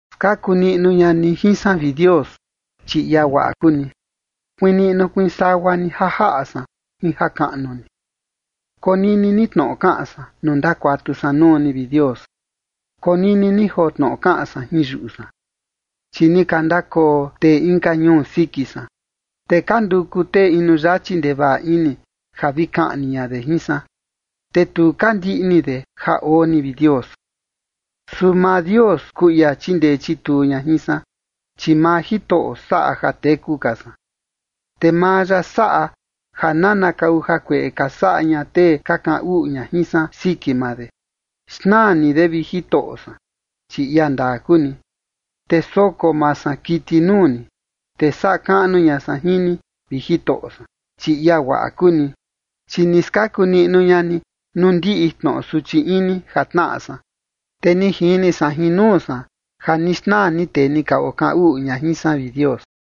Skaku niꞌnu ña ni jin san, vi Dios, chi ia guaꞌa kuu ni. Kuiin niꞌnu kuiin sagua ni ja jaꞌa san jin jakaꞌnu ni. Konini ni tnoꞌo kaꞌan san nuu ndakuatu san nuu ni, vi Dios. Konini ni joo tnoꞌo kaꞌan san jin yuꞌu san. Chi ni ka ndakoo tee inka ñuu siki san, te ka nduku tee inu yachi ndevaꞌa ini ja vi kaꞌni ña de jin san, te tu ka ndiꞌni de ja oo ni, vi Dios. Su maa Dios kuu ia chindee chituu ña jin san, chi maa Jitoꞌo saꞌa ja teku ka san. Te maa ya saꞌa ja nanakau jakueꞌe ka saꞌa ña tee ka kaꞌan uꞌu ña jin san siki maa de. Xnaa ni de, vi Jitoꞌo san, chi ia ndaa kuu ni. Te soko maa san kiti nuu ni, te saꞌa kaꞌnu ña san jin ni, vi Jitoꞌo san, chi ia guaꞌa kuu ni. Chi ni skaku niꞌnu ña ni nuu ndiꞌi tnoꞌo suchi ini ja tnaꞌa san, te ni jini san jin nuu san ja ni xnaa ni tee ni ka okaꞌan uꞌu ña jin san, vi Dios.